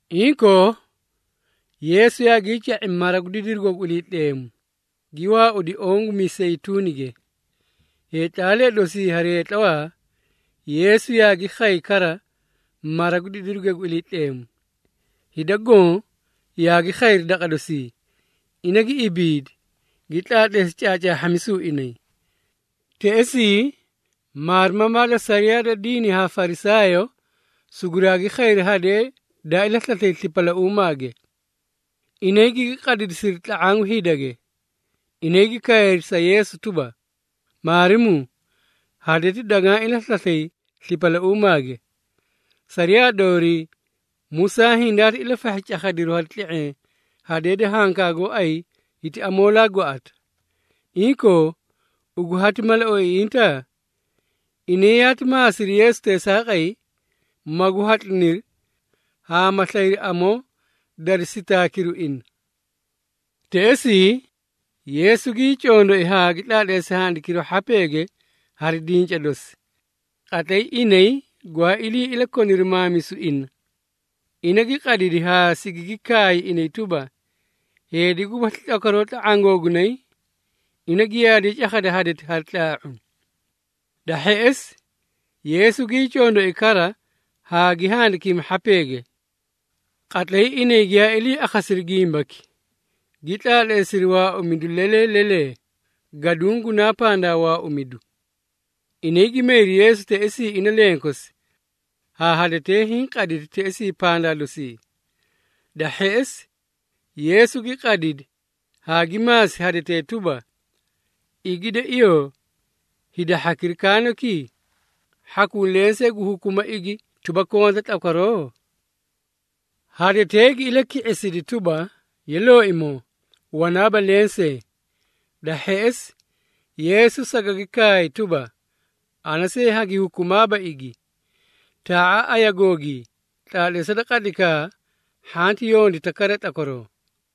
Inkoo, Yeesu yaagii ca⁄i mara gu didirugo gu Iliitleemu, gi waaudi oõ gu Miseyituunige. Heetlaalee dosii hari heetlawaa, Yeesu yaagi khay kara mara gu didiruge gu Iliitleemu. Hida goõ yaagi khayri daqa dosii, ina gi ibiidi, gi tlaatleesi caacaahhamisu inay. Teꞌesii, maarimamaa da sariyaa da diini haa Farisaayoo suguraagi khayri hadee daa ilaslaslay slipalauumage. Inay gigi qadidisiri tla⁄aã gu hidage. Inay gi kaayri sa Yeesu tuba, “Maarimuu, hadeti dagaã ilaslaslay slipalauumage. Sariyaa doorii, Musaa hindaati ilafahhi cakhadiru hari tle⁄eẽ hadee da hankaa gooay hiti amoolaa gwaꞌata. Inkoo, ugu hati mala oiiꞌinta?” Inay yaati maasiri Yeesu teesaaqay, magu hatliniri haa ma slayri amoo dari sitaakiru ina. Teꞌesii, Yeesu gii condoi haa gi tlaatleesi handikiru hhapeege hari dinca dosi. Qatlay inay gwaa ilii ilakoniri maamisu ina, ina gi qadidi haa sigigi kaay inay tuba, “Heedi gubasli tlakwaroo tla⁄aã googunay, ina giyaadiye cakhada hadeti hari tlaa⁄u.” Da hheꞌesi, Yeesu gii condoi kara haa gi handikimi hhapeege. Qatlay inay giyaa ilii akhasiri gimbaki, gi tlaatleesiri waaumidu lelee lelee, gaduũ gunaa pandaa waaumidu. Inay gi mayri Yeesu teꞌesii ina lenkosi, haa hadetee hiĩ qaditi teꞌesii pandaa dosii. Da hheꞌesi, Yeesu gi qadidi haa gi maasi hadetee tuba, “Igi de iyoo, hida hhakira kaanoki? Hhakuu lensee gu hukuma igi tuba konta tlakwaroo?” Hadetee gi ilaki⁄isidi tuba, “Ye Looimoo, wanaaba lensee.” Da hheꞌesi, Yeesu sagagi kaay tuba, “Ana see hagi hukumaaba igi. Taa⁄a ayigoogii, tlaatleesa da qatlaykaa hanti yondita kara tlakwaroo.”]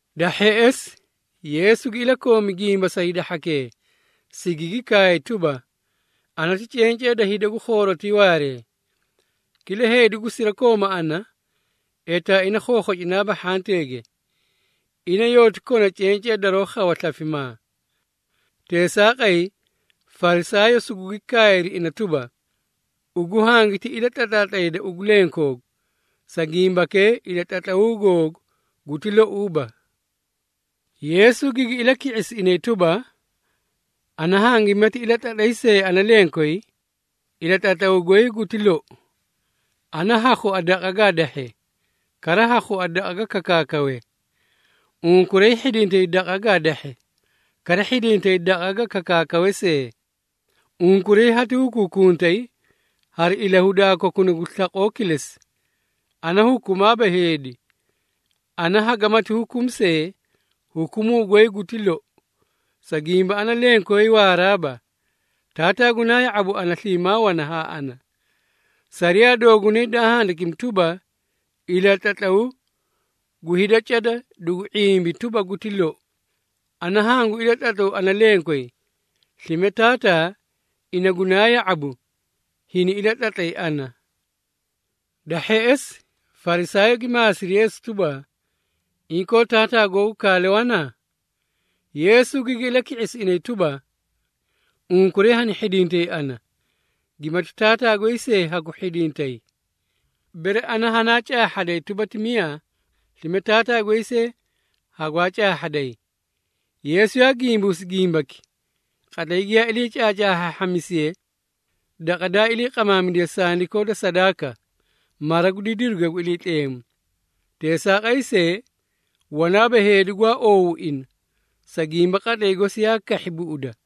Da hheꞌesi, Yeesu gi ilakoomi gimba sa hida hhakee, sigigi kaay tuba, “Ana ti cencee da hida gu khoorotii waaree. Kila heedi gu sirakooma ana, etaa ina khokhocinaaba hhanteege. Ina yooti kona cencee daroó khawa slafimaa.” Teesaaqay, Farisaayoo sugugi kaayri ina tuba, “Ugu hangiti ilatlatlaatlayda ugu lenkoogu. Sa gimbakee ilatlatlaw googu guti louuba.” Yeesu gigi ilaki⁄isi inay tuba, “Ana hangimati ilatlatlay see ana lenkoyi, ilatlatlawu goy guti lou. Ana ha khua daqa gaa dahhe, kara ha khua daqa ga kakaakawe. Unkuray ha hhidintay daqa gaa dahhe, kara hhidintay daqa ga kakaakawe see. Unkuray hati hukuukuntay hari ilahudaa kokuna gu slaqoo kilesi. Ana hukumaaba heedi. Ana hagamati hukumi see, hukumuu goy guti lou, sa gimba ana lenkoyi waaraaba. Taataa gunaa ya⁄abu ana sliimaa wana haa ana. Sariyaa doogunayge daa handikimi tuba, ‘Ilatlatlaw gu hida cada dugu ⁄imbi tuba, guti loi.’ Ana hangu ilatlatlawu ana lenkoyi, slime Taataa, ina gunaa ya⁄abu, hini ilatlatlay ana.” Da hheꞌesi, Farisaayoo gi maasiri Yeesu tuba, “Inkoo, Taataa googu kaale wana?” Yeesu gigi ilaki⁄isi inay tuba, “Unkuray hani hhidintay ana, gimati Taataa goy see hagu hhidintay. Bere ana hanaa caahhaday tuba ti miyaa, slime Taataa goy see hagwaa caahhaday.” Yeesu yaa gimbuusi gimbaki, qatlay giyaa ilii caacaahhaahhamisiye daqa daa iliiqamaamidiye sandikoo da sadaaka, mara gu didiruge gu Iliitleemu. Teesaaqay see, wanaaba heedi gwaa oow ina, sa gimba qatlay gosi yaa kahhi buꞌuda.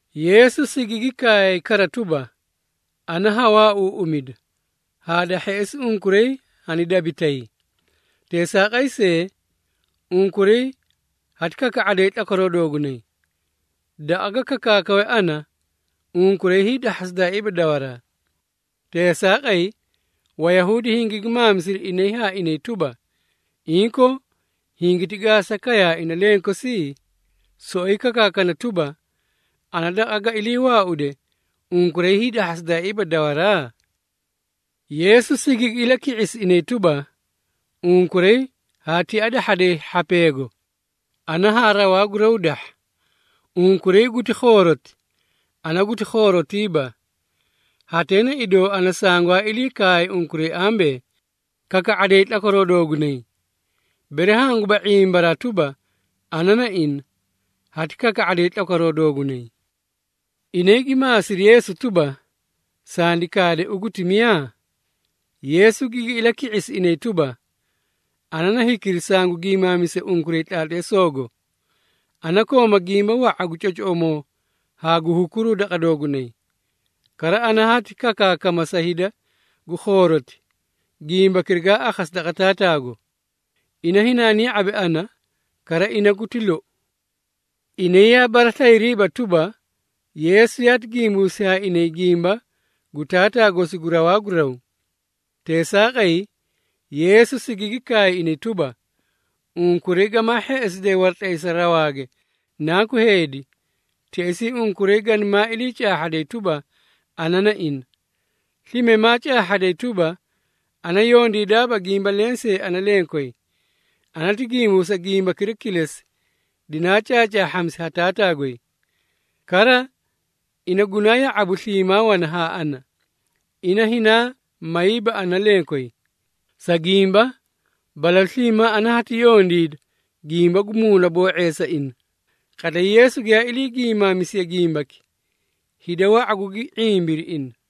Yeesu sigigi kaay kara tuba, “Ana ha waauuꞌumida, haa da hheꞌesi unkuray hanidabitay. Teesaaqay see, unkuray hati kaka⁄aday tlakwaroo doogunay. Daqa ga kakaakawe ana, unkuray hiidahhasidaaiiba dawaraa.” Teesaaqay, Wayahuudi hingigi maamisiri inay haa inay tuba, “Inkoo, hingiti gaasa kayaa ina lenkosi? Soꞌoyi kakaana tuba, ‘Ana daqa ga iliiwaaude unkuray hiidahhasidaaiiba dawaraa?’” Yeesu sigigi ilaki⁄isi inay tuba, “Unkuray haa tia dahhaday hhapeego, ana haa rawaa gu raw dahha. Unkuray guti khooroti, ana guti khoorotiiba. Hatee na idoo ana sangwaa ilii kaay unkuray ambee, kaka⁄aday tlakwaroo doogunay. Bere hanguba ⁄imbaraa tuba, ana na ina, hati kaka⁄aday tlakwaroo doogunay.” Inay gi maasiri Yeesu tuba, “Sandi kaade ugu ti miyaa?” Yeesu gigi ilaki⁄isi inay tuba, “Ana na hikira sangu giimaamise unkuray tlaatleesoogo. Ana kooma gimba wa⁄a gu cocoꞌomoo haa gu hukuruu daqa doogunay. Kara, ana hati kakaakama sa hida gu khooroti, gimbakira gaa akhasi daqa Taataago. Ina hinaani ya⁄abi ana, kara ina guti lou.” Inay yaa baraslayiriiba tuba, Yeesu yaati gimbuusi haa inay gimba gu Taataa gosi gu rawaa gu raw. Teesaaqay, Yeesu sigigi kaay inay tuba, “Unkuray gamaa hheꞌesidee waratlaysa rawaage Nanku Heedi, teꞌesii unkuray ganimaa ilii caahhaday tuba, ana na ina. Slime maa caahhaday tuba, ana yondiidaaba gimba lensee ana lenkoy. Ana ti gimbuusa gimbakira kilesi, dinaa caacaahhamisi ha Taataa goy. Kara, ina gunaa ya⁄abu sliimaa wana haa ana. Ina hinaa mayiiba ana lenkoyi, sa gimba balalu sliimaa ana hati yondiida gimba gu muunaboo⁄eesa ina.” Qatlay Yeesu giyaa ilii gimaamisiye gimbaki, hida wa⁄a gugi ⁄imbiri ina.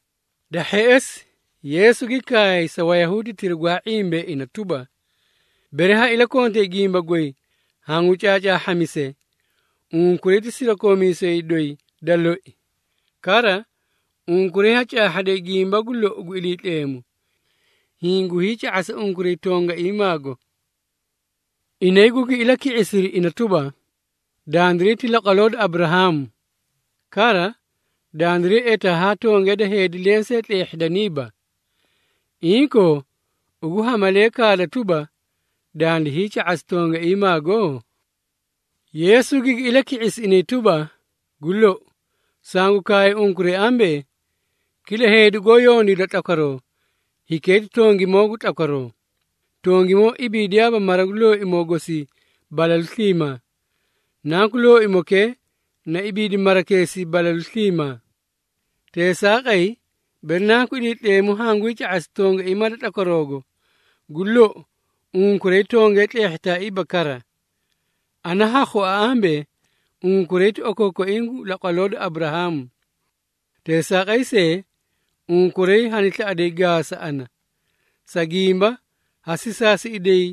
Da hheꞌesi, Yeesu gi kaay sa Wayahuuditira gwaa ⁄imbee ina tuba, “Bere ha iliikontay gimba goy hangu caacaahhaahhamise, unkuray ti sirakoomiisee doyi da loi. Kara, unkuray ha caahhaday gimba gu lou gu Iliitleemu, hiĩ gu hiica⁄asa unkuray tongaiimaago.” Inay gugi ilaki⁄isiri ina tuba, “Dandiray ti laqwaloo da Aburahaamu. Kara, dandiray etaa haa tongee da heedi lensee tleehhidaniiba. Inkoo, ugu ha malee kaada tuba, dandi hiica⁄asi tongaiimaago?” Yeesu gigi ilaki⁄isi inay tuba, “Gu lou, sangu kaay unkuray ambee, kila heedi goó yondiida tlakwaroo, hikee ti tongimoo gu tlakwaroo. Tongimoo ibiidiyaaba mara gu looimoo gosii balalu sliimaa. Nanku looimokee na ibiidi marakeesii balalu sliimaa. Teesaaqay, bere Nanku Iliitleemu hangu hiica⁄asi tongaiimaa da tlakwaroogo, gu lou, unkuray tongee tleehhitaaiiba kara. Ana ha khua ambee, unkuray ti okookoiĩ gu laqwaloo da Aburahaamu. Teesaaqay see, unkuray hani slaꞌaday gaasa ana, sa gimba, ha sisaasiꞌiday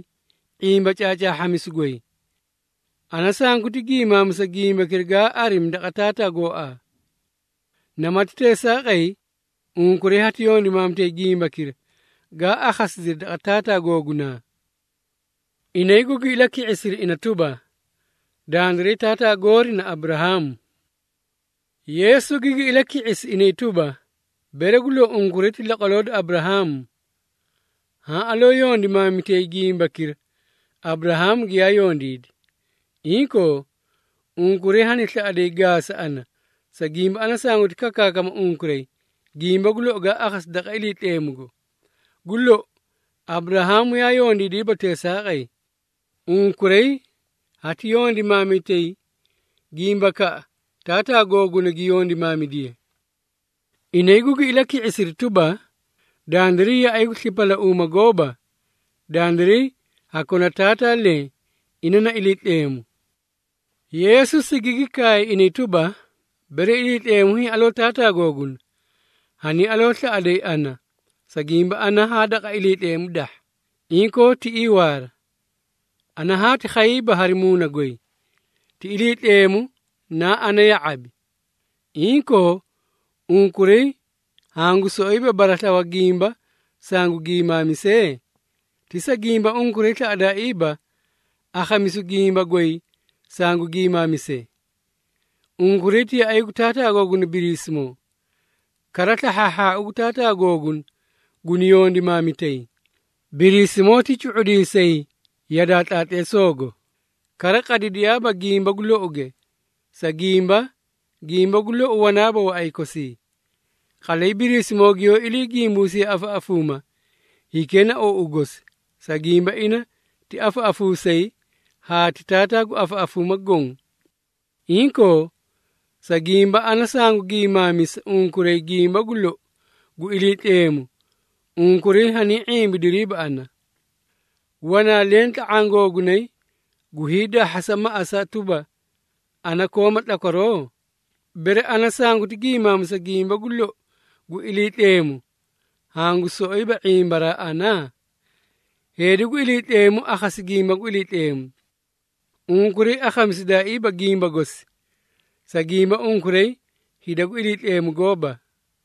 ⁄imba caacaahhamisu goy. Ana sanguti giimaamisa gimbakira gaa arimi daqa Taataa gooaa. Namati Teesaaqay, unkuray hati yondimaamitay gimbakira gaa akhasidiri daqa taataa googunaa.” Inay gugi ilaki⁄isiri ina tuba, “Dandiray taataa goori na Aburahaamu!” Yeesu gigi ilaki⁄isi inay tuba, “Bere gu lou unkuray ti laqwaloo da Aburahaamu, haã aloo yondimaamitay gimbakira Aburahaamu giyaa yondiidi. Inkoo, unkuray hani slaꞌaday gaasa ana, sa gimba ana sanguti kakaakama unkuray, gimba gu lou gaa akhasi daqa Iliitleemugo. Gu lou, Aburahaamu yaa yondiidiiba teesaaqay. Unkuray hati yondimaamitay gimbakaꞌa taataa googuna gi yondimaamidiye.” Inay gugi ilaki⁄isiri tuba, “Dandiray yaꞌay gu slipalauuma gooba. Dandiray ha kona Taataa leẽ, ina na Iliitleemu.” Yeesu sigigi kaay inay tuba, “Bere Iliitleemu hiĩ aloo Taataa googuna, haniĩ aloo slaꞌaday ana, sa gimba ana haa daqa Iliitleemu dahha, inkoo tiꞌii waara. Ana haati khayiiba hari muuna goy, ti Iliitleemu naa ana ya⁄abi. Inkoo, unkuray hangu soꞌoyiba baraslawa gimba sangu giimaamise? Ti sa gimba unkuray slaꞌadaaiiba akhamisu gimba goy sangu giimaamise. Unkuray ti yaꞌay gu taataa googuna Biriisimoo, kara slahhaahhaau gu taataa googuna guni yondimaamitay. Biriisimoo ti cu⁄udiisay yadaa tlaatleesoogo, kara qadidiyaaba gimba gu louge, sa gimba, gimba gu lou wanaaba waꞌay kosii. Qatlay Biriisimoo giyoó ilii gimbuusiye afaꞌafuuma, hikee na ou gosi, sa gimba ina ti afaꞌafuusay haa ti taataa gu afaꞌafuuma goõ. Inkoo, sa gimba ana sangu giimaamisa unkuray gimba gu lou gu Iliitleemu, unkuray haniĩ ⁄imbidiriiba ana. Wanaa leẽ tla⁄aã googunay gu hiidahhasa maꞌasa tuba, ana kooma tlakwaroo? Bere ana sanguti giimaamisa gimba gu lou gu Iliitleemu, hangu soꞌoyiba ⁄imbaraa ana? Heedi gu Iliitleemu, akhamisi gimba gu Iliitleemu. Unkuray akhamisidaaiiba gimba gosi, sa gimba unkuray hida gu Iliitleemu gooba.”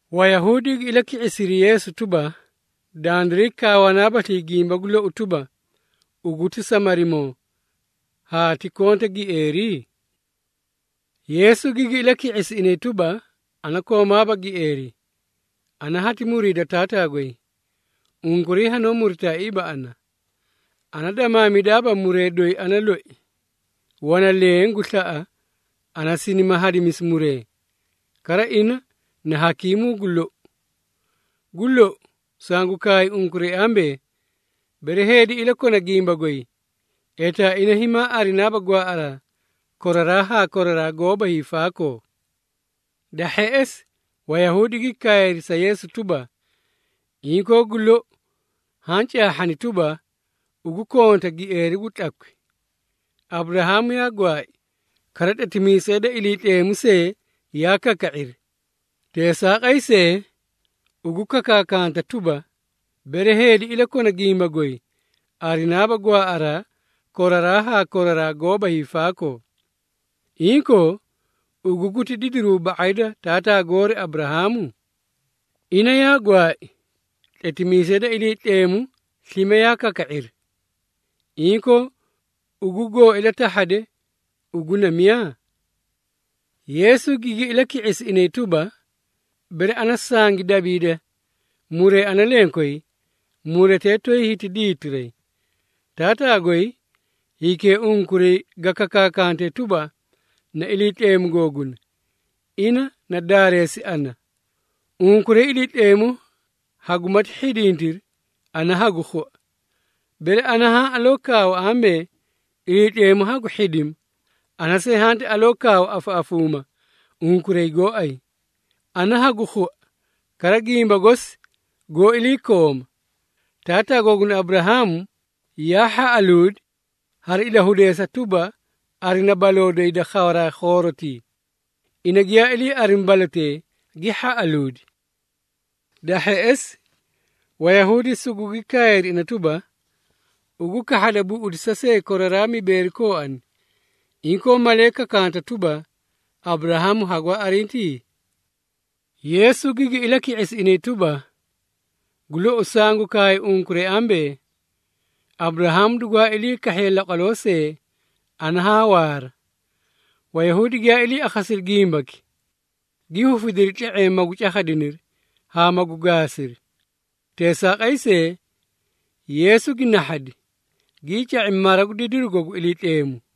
Wayahuudi gi ilaki⁄isiri Yeesu tuba, “Dandiray kaawanaabaslii gimba gu lou tuba, ugu ti Samarimoo, haa ti konta gieeri?” Yeesu gigi ilaki⁄isi inay tuba, “Ana koomaaba gieeri, ana hati muriida Taataa goy. Unkuray hanoó muritaaiiba ana. Ana damaamidaaba muree doyi ana loi. Wana leẽ gu slaꞌa, ana sinima hadimisi muree, kara ina na hakiimuu gu lou. Gu lou, sangu kaay unkuray ambee, bere heedi iliikona gimba goy, etaa ina himaa arinaaba gwaaꞌaraa koraraa haa koraraa goóba hiifaakoo.” Da hheꞌesi, Wayahuudi gi kaayri sa Yeesu tuba, “Inkoo gu lou haã caahhani tuba, ugu konta gieeri gu tlakwi! Aburahaamu yaa gwaai, kara tletimiisee da Iliitleemu see yaa kaka⁄iri. Teesaaqay see, ugu kakaakanta tuba, ‘Bere heedi iliikona gimba goy, arinaaba gwaaꞌaraa koraraa haa koraraa goóba hiifaakoo.’ Inkoo, ugu guti didiruu ba⁄ay da taataa goori Aburahaamu? Ina yaa gwaai, tletimiisee da Iliitleemu slime yaa kaka⁄iri. Inkoo, ugu goo ilatahhade, ugu na miyaa?” Yeesu gigi ilaki⁄isi inay tuba, “Bere ana sangi dabiida muree ana lenkoyi, muretee toyi hiti diitiray. Taataa goy, hikee unkuray ga kakaakantee tuba, na Iliitleemu googuna, ina na daareesi ana. Unkuray, Iliitleemu hagumati hhidintiri, ana hagu khua. Bere ana haã aloo kaawa ambee, Iliitleemu hagu hhidima, ana see hanti aloo kaawa afaꞌafuuma unkuray gooay. Ana hagu khua, kara gimba gosi goó iliikooma. Taataa googuna Aburahaamu yaa hhaꞌaluudi, hari ilahudeesa tuba, arina baloo doyi da khawaraa khoorotii. Ina giyaa ilii arimi balotee, gi hhaꞌaluudi.” Da hheꞌesi, Wayahuudi sugugi kaayri ina tuba, “Ugu kahhada buꞌudisa see koraraa mibeeri kooani! Inkoo, malee kakanta tuba, Aburahaamu hagwaa arinti?” Yeesu gigi ilaki⁄isi inay tuba, “Gu lou sangu kaay unkuray ambee, Aburahaamu dugwaa ilii kahhiye laqwaloo see, ana haa waara.” Wayahuudi giyaa ilii akhasiri gimbaki, gi hufidiri tle⁄eẽ magu cakhadiniri haa magu gaasiri. Teesaaqay see, Yeesu gi nahhadi, gii ca⁄i mara gu didirugo gu Iliitleemu.